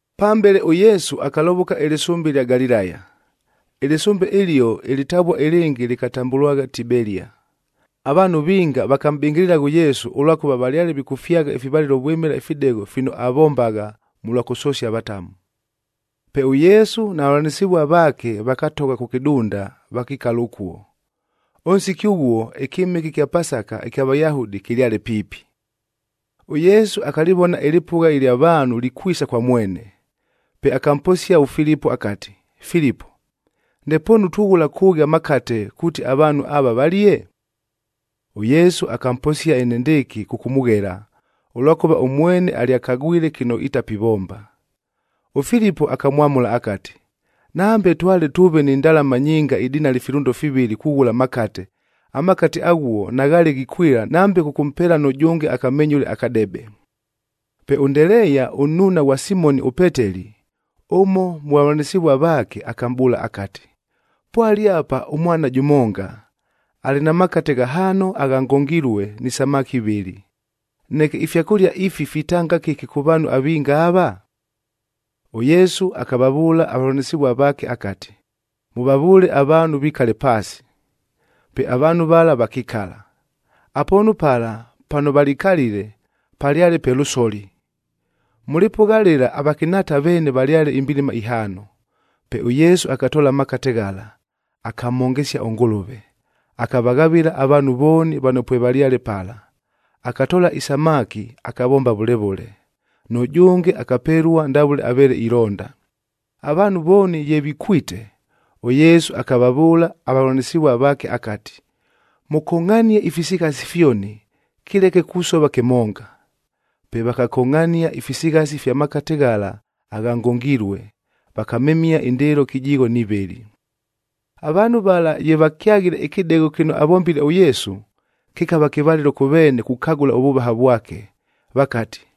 Pambele ʉYesu akalovoka ɨlɨsʉmbe ɨlya Galilaya. Ɨlɨsʉmbe ɨlio ɨlɨtavua ɨlɨngɨ lɨkatambʉlwagha Tibelia. Avaanhu vinga vakamʼbɨngɨlɨla ʉYesu, ʉlwakʉva valyale vikʉfyagha ifivalɨlo vwɨmɨla ifidegho fino avombagha mʉlwa kʉsosia avatamu. Pe ʉYesu na vavʉlanɨsɨvua vaake vakatogha kʉ kɨdunda, vakikala ʉkuo. Ʉnsiki ʉghuo, ɨkyɨmɨke ɨkya Pasaka ɨkya Vayahudi kɨlyale piipi. ɄYesu akalɨvona ɨlɨpʉgha ɨlya vaanhu likwisa kwa mwene. Pe akamposia ʉFilipo akati, “Filipo, ndepoonu tughʉla kʉʉghi amakate, kuuti avaanhu ava valie?” ɄYesu akamposia enendɨɨkɨ kʉkʉmʉghela, ʉlwakʉva ʉmwene alyakagwile kɨno itapivomba. ɄFilipo akamwamʉla akati, “Nambe twale tʉʉve ni ndalama nyinga idinali filʉndo fivɨlɨa kughʉla amakate, amakate aghuo naghaale ghikwɨla nambe kʉkʉmpeela nʉjʉnge akamenyʉle akadebe.” Pe ʉNdeleeya ʉnnuuna ghwa Simoni ʉPeteli, ʉmo mʉ vavʉlanɨsɨvua vaake, akamʼbʉʉla akati, “Pwale apa ʉmwana jʉmonga, alɨ na makate ghahaano agha ngongilue ni samaki ivɨlɨ. Neke ifyakʉlia ifi fitanga kɨki kʉ vaanhu avinga ava?” ɄYesu akavavʉʉla avavʉlanɨsɨvua vaake akati, “Mʉvavʉʉle avaanhu vikale paasi.” Pe avaanhu vala vakikala. Apoonu pala pano valikalile, palyale pe lʉsoli. Mʉ lɨpʉgha lɨla avakɨnhaata veene valyale imbilima ihaano. Pe ʉYesu akatoola amakate ghala, akamhongesia ʉNgʉlʉve, akavaghavɨla avaanhu vooni vano pwevalyale pala. Akatoola isamaki akavomba vʉle vʉle. Nʉjʉnge akapelua ndavʉle aveele ilonda. Avaanhu vooni ye vikwite, ʉYesu akavavʉʉla avavʉlanɨsɨvua vaake akati, “Mʉkongʼhanie ifisighasi fyoni, kɨleke kusova kɨmonga.” Pe vakakongʼhania ifisighasi ifya makate ghala agha ngongilue, vakamemia indɨɨlo kɨjigho ni vɨlɨ. Avaanhu vala ye vakyaghile ɨkɨdegho kɨno avombile ʉYesu, kɨkava kɨvalɨlo kʉ veene kukagʉla ʉvʉvaha vwake, vakati,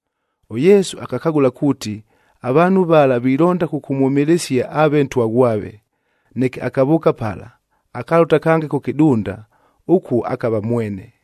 ɄYesu akakagʉla kuuti avaanhu vala vilonda kʉkʉmwʉmɨlɨsia aave Ntwa ghwave. Neke akavʉʉka pala, akalʉta kange kʉ kɨdunda, ʉkuo akava mwene.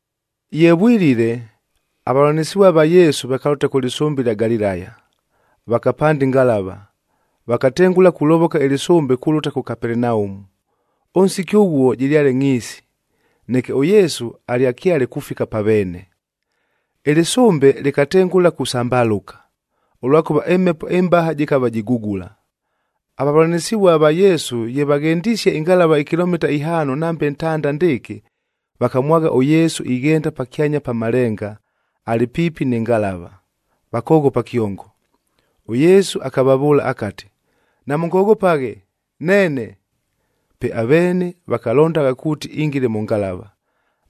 Ye vwilile, avavʉlanɨsɨvua va Yesu vakalʉta kʉ lɨsʉmbe ɨlya Galilaya. Vakapanda ɨngalava,c vakatengʉla kulovoka ɨlɨsʉmbe kulʉta kʉ Kapelenaumu. Ʉnsiki ʉghuo jɨlyale ngʼhiisi, neke ʉYesu alyakyale kufika pa veene. Ɨlɨsʉmbe lɨkatengʉla kusambalʉka, ʉlwakʉva ɨmhepo ɨmbaha jɨkava jigugula. Avavʉlanɨsɨvua va Yesu ye vaghendisie ɨngalava ikilomita ihaano nambe ntanda ndɨɨkɨ, vakamwagha ʉYesu ighenda pakyanya pa malenga, alɨ piipi nɨ ngalava, vakoghopa kyongo. ɄYesu akavavʉʉla akati, “Namʉngoghopaghe, neene!” Pe aveene vakalondagha kuuti ingile mʉ ngalava.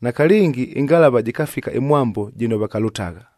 Nakalɨngi ɨngalava jɨkafika ɨmwambo jɨno vakalʉtagha.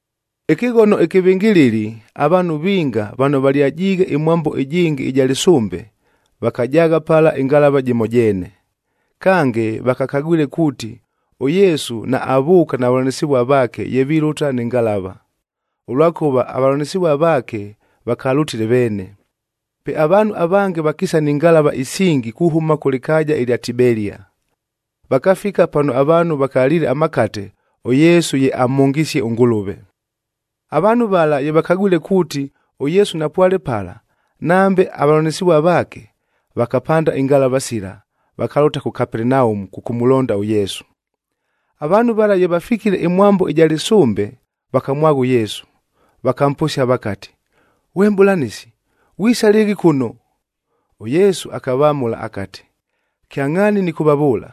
Ɨkɨghono ɨkɨvɨngɨlɨli, avaanhu vinga vano valyajiighe ɨmwambo ɨjɨngɨ ɨja lɨsʉmbe, vakajaagha pala ɨngalava jɨmo jeene. Kange, vakakagwile kuuti ʉYesu naavʉʉka na vavʉlanɨsɨvua vaake ye vilʉta nɨ ngalava, ʉlwakʉva avavʉlanɨsɨvua vaake vakalʉtile veene. Pe avaanhu avange vakiisa ni ngalava isingi kuhʉma kʉ lɨkaaja ɨlya Tibelia, vakafika pano avaanhu vakaliile amakate, ʉYesu ye amhongisie ʉNgʉlʉve. Avaanhu vala ye vakagwile kuuti, ʉYesu napwale pala, nambe avavʉlanɨsɨvua vaake, vakapanda ingalava sila, vakalʉta kʉ Kapelenaumu kʉkʉmʉlonda ʉYesu. Avaanhu vala ye vafikile ɨmwambo ɨja lɨsʉmbe, vakamwagha ʉYesu, vakamposia vakati, “Ghwe Mʼbʉlanɨsi, ghwisa lɨɨghi kʉno?” ɄYesu akavamʉla akati, “Kyangʼhaani nɨkʉvavʉʉla,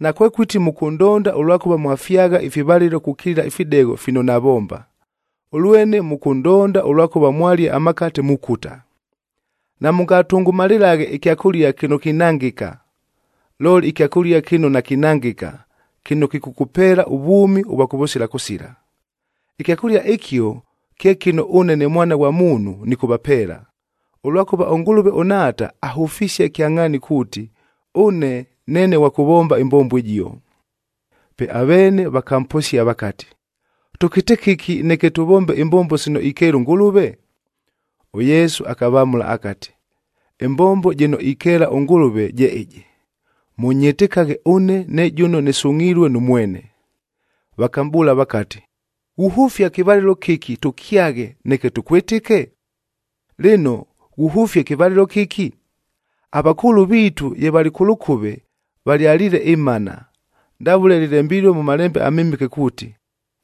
nakwekʉti mʉkʉndonda ʉlwakʉva mwafyagha ifivalɨlo kukilila ifidegho fino navomba, ʉlwene mʉkʉndonda ʉlwakʉva mwalia amakate, mukuta. Namʉngatʉngʉmalɨlaghe ɨkyakʉlia kɨno kinangɨka, looli ɨkyakʉlia kɨno nakinangɨka, kɨno kɨkʉkʉpeela ʉvwʉmi ʉvwa kʉvʉsila kʉsila. Ɨkyakʉlia ɨkio kye kɨno ʉne ne Mwana ghwa Muunhu nɨkʉvapeela, ʉlwakʉva ʉNgʉlʉve ʉNhaata ahʉfisie kyangʼhaani kuuti, ʉne neene ghwa kʉvomba ɨmbombo ɨjio.” Pe aveene vakamposia vakati, “Tʉkɨte kɨki neke tʉvombe imbombo sino ikeela ʉNgʉlʉve?” ɄYesu akavamʉla akati, “Ɨmbombo jɨno ikeela ʉNgʉlʉve je ɨjɨ: Mʉnyɨtɨkaghe ʉne ne jʉno nɨsungʼhilue nʉ mwene.” Vakamʼbʉʉla vakati, “Ghuhʉfia ɨkɨvalɨlo kɨki tʉkyaghe, neke tʉkwɨtɨke? Lɨno, ghuhʉfia ɨkɨvalɨlo kɨki? Avakʉʉlʉ viitu ye valɨ kʉ lʉkʉve, valyaliile ɨmana,d ndavʉle lɨlembilue mʉ Malembe aMɨmɨke kuuti,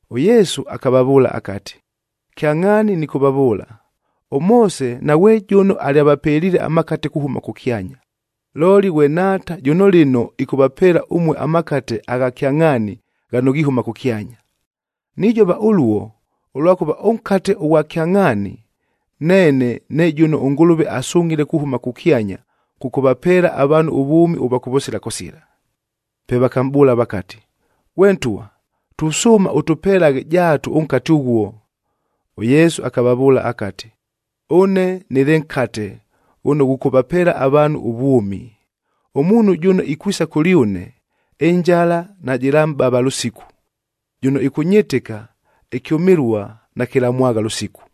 ɄYesu akavavʉʉla akati, “Kyangʼhaani nɨkʉvavʉʉla, ʉMoose naghwe jʉno alyavapeliile amakate kuhʉma kʉkyanya, looli ghwe Nhaata jʉno lɨno ɨkʉvapeela ʉmue amakate agha kyangʼhaani ghano ghihʉma kʉkyanya. Nijova ʉluo, ʉlwakʉva ʉnkate ʉghwa kyangʼhaani, neene ne jʉno ʉNgʉlʉve asungʼhile kuhʉma kʉkyanya kʉkʉvapeela avaanhu ʉvwʉmi ʉvwa kʉvʉsila kʉsila.” Pe vakamʼbʉʉla vakati, “Ghwe ntwa, tusʉʉma ʉtʉpelaghe jaatu ʉnkate ʉghuo.” ɄYesu akavavʉʉla akati, “Ʉne nɨlɨ nkatef ghʉno ghʉkʉvapeela avaanhu ʉvwʉmi. Ʉmuunhu jʉno ikwisa kʉlyʉne, ɨnjala najɨlamʼbava lʉsiku, jʉno ɨkʉnyɨtɨka, ɨkyʉmɨlua nakɨlamwagha lʉsiku.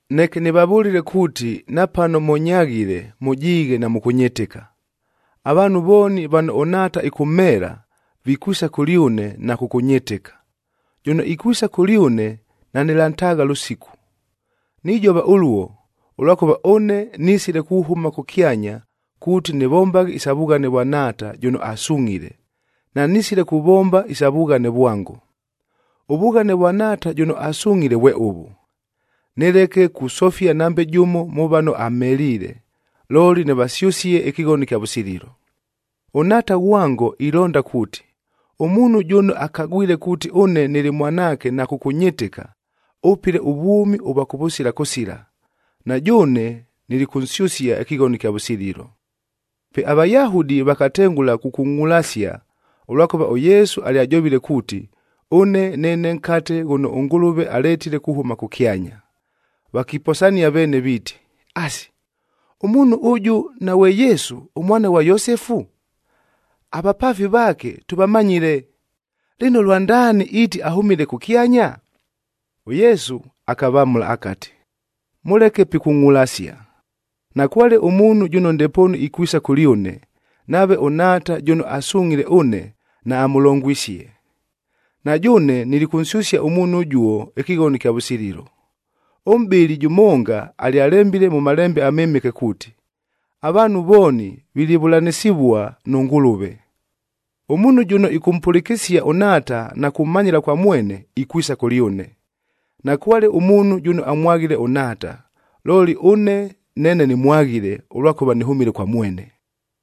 “Neke nɨvavʉlile kuuti napano mʉnyaghile, mʉjiighe namʉkʉnyɨtɨka. Avaanhu vooni vano ʉNhaata ɨkʉmheela, vikwisa kʉlyʉne na kʉkʉnyɨtɨka. Jʉno ikwisa kʉlyʉne nanɨlantaagha lʉsiku. Nijova ʉluo, ʉlwakʉva ʉne nisile kuhʉma kʉkyanya kuuti nɨvombaghe isa vughane vwa Nhaata jʉno asungʼhile, nanisile kuvomba isa vughane vwango. Ʉvughane vwa Nhaata jʉno asungʼhile vwe ʉvʉ: Nɨleke kusofia nambe jʉmo mʉ vano amheliile, looli nɨvasyʉsie ɨkɨghono ɨkya vʉsililo. ɄNhaata ghwango ilonda kuuti, ʉmuunhu jʉno akagwile kuuti ʉne nɨlɨ Mwanaake na kʉkʉnyɨtɨka, ʉpɨle ʉvwʉmi ʉvwa kʉvʉsila kʉsila. Na jʉʉne nilikʉnsyʉsia ɨkɨghono ɨkya vʉsililo.” Pe aVayahudi vakatengʉla kukungʼulasia, ʉlwakʉva ʉYesu alyajovile kuuti, “Ʉne neene nkate ghʉno ʉNgʉlʉve aletile kuhʉma kʉkyanya.” Vakiposania veene viiti, “Asi, ʉmuunhu ʉjʉ naghwe Yesu, ʉmwana ghwa Yosefu? Avapaafi vaake tʉvamanyile! Lɨno, lwandaani iiti ahʉmile kʉkyanya?” ɄYesu akavamʉla akati, “Mʉleke pikungʼulasia. Nakwale ʉmuunhu jʉno ndepoonu ikwisa kʉlyʉne, nave ʉNhaata jʉno asungʼhile ʉne naamʉlongwisie. Na jʉʉne nilikʉnsyʉsia ʉmuunhu ʉjuo ɨkɨghono ɨkya vʉsililo. Ʉmʼbɨli jʉmonga alyalembile mʉ Malembe aMɨmɨke kuuti, ‘Avaanhu vooni vilivʉlanɨsɨvua nʉ Ngʉlʉve.’g Ʉmuunhu jʉno ɨkʉmpʉlɨkɨsia ʉNhaata na kumanyɨla kwa mwene, ikwisa kʉlyʉne. Nakwale ʉmuunhu jʉno amwaghile ʉNhaata, looli ʉne neene nɨmwaghile, ʉlwakʉva nɨhʉmile kwa mwene.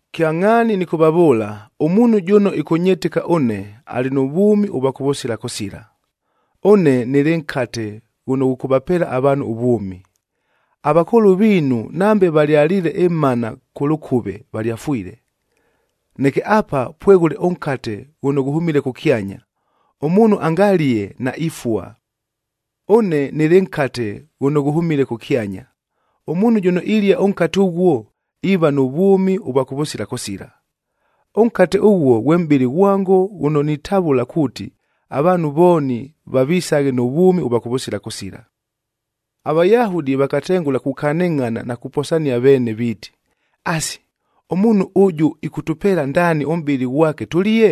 “Kyangʼhaani nɨkʉvavʉʉla, ʉmuunhu jʉno ɨkʉnyɨtɨka ʉne, alɨ nʉ vwʉmi ʉvwa kʉvʉsila kʉsila. Ʉne nɨlɨ nkate ghʉno ghʉkʉvapeela avaanhu ʉvwʉmi. Avakʉʉlʉ viinu nambe valyaliile ɨmana kʉ lʉkʉve, valyafwile. Neke apa pweghʉle ʉnkate ghʉno ghʉhʉmile kʉkyanya, ʉmuunhu angalie, naifua. Ʉne nɨlɨ nkate ghʉno ghʉhʉmile kʉkyanya. Ʉmuunhu jʉno ilia ʉnkate ʉghuo, iiva nʉ vwʉmi ʉvwa kʉvʉsila kʉsila. Ʉnkate ʉghuo ghwe mʼbɨlɨ ghwango ghʉno nitavʉla kuuti, avaanhu vooni vavisaghe nʉ vwʉmi ʉvwa kʉvʉsila kʉsila.” AVayahudi vakatengʉla kukanɨngʼhana na kuposania veene viiti, “Asi, ʉmuunhu ʉjʉ ɨkʉtʉpeela ndaani ʉmʼbɨlɨ ghwake tʉlie?”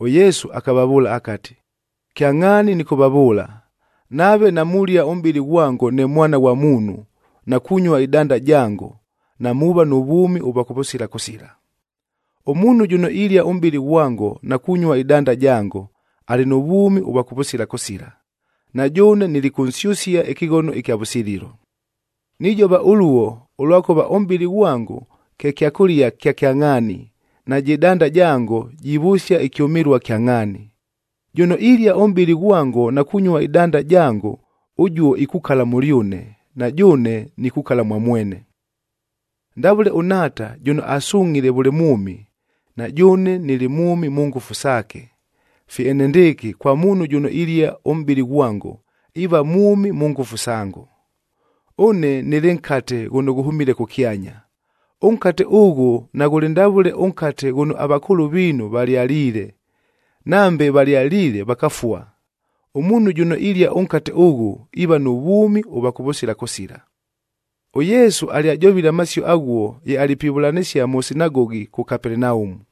ɄYesu akavavʉʉla akati, “Kyangʼhaani nɨkʉvavʉʉla, nave namulia ʉmʼbɨlɨ ghwango ne Mwana ghwa Muunhu, na kunyua ɨdanda jango, namuuva nʉ vwʉmi ʉvwa kʉvʉsila kʉsila. Ʉmuunhu jʉno ilia ʉmʼbɨlɨ ghwango na kunyua ɨdanda jango, alɨ nʉ vwʉmi ʉvwa kʉvʉsila kʉsila, na jʉʉne nilikʉnsyʉsia ɨkɨghono ɨkya vʉsililo. Nijova ʉluo, ʉlwakʉva ʉmʼbɨlɨ ghwango kye kyakʉlia kya kyangʼhaani, najɨ danda jango jivʉsia ɨkyʉmɨlua kyangʼhaani. Jʉno ilia ʉmʼbɨlɨ ghwango na kunyua ɨdanda jango, ʉjuo ikukala mʉlyʉne, na jʉʉne nikukala mwa mwene. “Ndavʉle ʉNhaata jʉno asungʼhile vʉle mwʉmi, na jʉʉne nɨlɨ mwʉmi mʉ ngʉfu saake, fye enendɨɨkɨ kwa muunhu jʉno ilia ʉmʼbɨlɨ ghwango, iiva mwʉmi mʉ ngʉfu sango. Ʉne nɨlɨ nkate ghʉno ghʉhʉmile kʉkyanya. Ʉnkate ʉghʉ naghʉlɨ ndavʉle ʉnkate ghʉno avakʉʉlʉ viinu valyaliile. Nambe valyaliile, vakafua. Ʉmuunhu jʉno ilia ʉnkate ʉghʉ, iiva nʉ vwʉmi ʉvwa kʉvʉsila kʉsila.” ɄYesu alyajovile amasio aghuo ye alɨ pivʉlanɨsia mʉ sinagogih kʉ Kapelenaumu.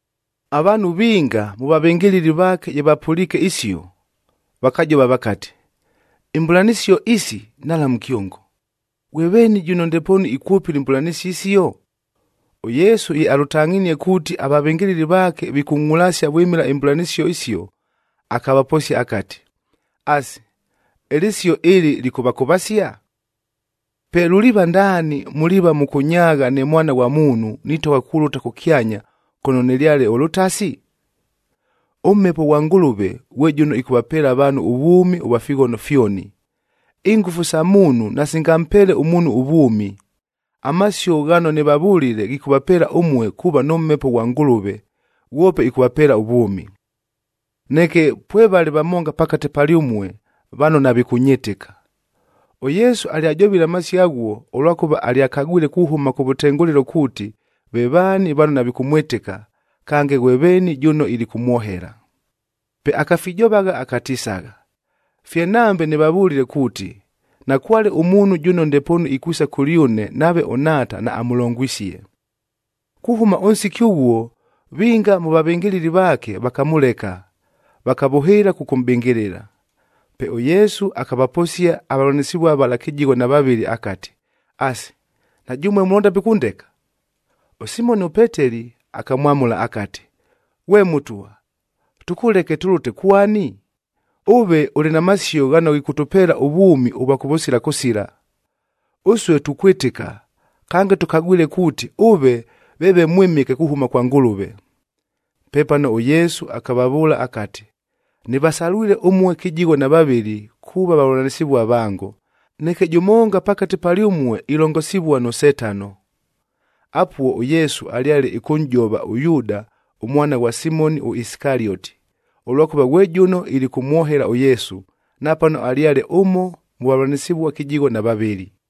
Avaanhu vinga mʉ vavɨngɨlɨli vaake ye vapʉliike isio, vakajova vakati, “Imbʉlanɨsio isi nhalamu kyongo! Ghwe veeni jʉno ndepoonu ikwʉpɨla imbʉlanɨsio isio?” ɄYesu ye alʉtangʼhinie kuuti avavɨngɨlɨli vaake vikungʼulasia vwɨmɨla imbʉlanɨsio isio, akavaposia akati, “Asi, ɨlɨsio ɨlɨ lɨkʉvakʉvasia? Pe luliiva ndaani, muliiva mʉkʉnyaagha ne Mwana ghwa Muunhu, nitogha kulʉta kʉkyanya kʉno nɨlyale ʉlʉtasi? ɄMhepo ghwa Ngʉlʉve ghwe jʉno ɨkʉvapeela avaanhu ʉvwʉmi ʉvwa fighono fyoni. Ingʉfu sa muunhu nasingampeele ʉmuunhu ʉvwʉmi. Amasio ghano nɨvavʉlile ghikʉvapeela ʉmue kuuva nʉ Mhepo ghwa Ngʉlʉve, ghwope ɨkʉvapeela ʉvwʉmi. “Neke pwevale vamonga pakate palyʉmue vano navikʉnyɨtɨka.” ɄYesu alyajovile amasio aghuo, ʉlwakʉva alyakagwile kuhʉma kʉvʉtengʉlɨlo kuuti ve vaani vano navikʉmwɨtɨka, kange ghwe veeni jʉno ilikʉmwohela. Pe akafijovagha akatisagha, “Fye nambe nɨvavʉlile kuuti, nakwale ʉmuunhu jʉno ndepoonu ikwisa kʉlyʉne nave ʉNhaata naamʉlongwisie.” Kuhʉma ʉnsiki ʉghuo, vinga mʉ vavɨngɨlɨli vaake vakamʉleka, vakavʉhɨɨla kʉkʉmʼbɨngɨlɨla. Pe ʉYesu akavaposia avavʉlanɨsɨvua vala kɨjigho na vavɨlɨ akati, “Asi, na jʉmue mulonda pikʉndeka?” ɄSimoni ʉPeteli akamwamʉla akati, “Ghwe Mʉtwa, tʉkʉleke tʉlʉte kwani? Ʉve ʉlɨ na masio ghano ghikʉtʉpeela ʉvwʉmi ʉvwa kʉvʉsila kʉsila. Ʉsue tukwɨtɨka, kange tʉkagwile kuuti, ʉve veeve Mwɨmɨke kuhʉma kwa Ngʉlʉve.” Pepano ʉYesu akavavʉʉla akati, “Nɨvasalwile ʉmue kɨjigho na vavɨlɨ kuuva vavʉlanɨsɨvua vango, neke jʉmonga pakate palyʉmue ilongosivua nʉ Setano.” Apuo ʉYesu alyale ɨkʉnʼjova ʉYuuda ʉmwana ghwa Simoni ʉIsikalioti, ʉlwakʉva ghwe jʉno ilikʉmwohela ʉYesu, napano alyale ʉmo mʉ vavʉlanɨsɨvua kɨjigho na vavɨlɨ.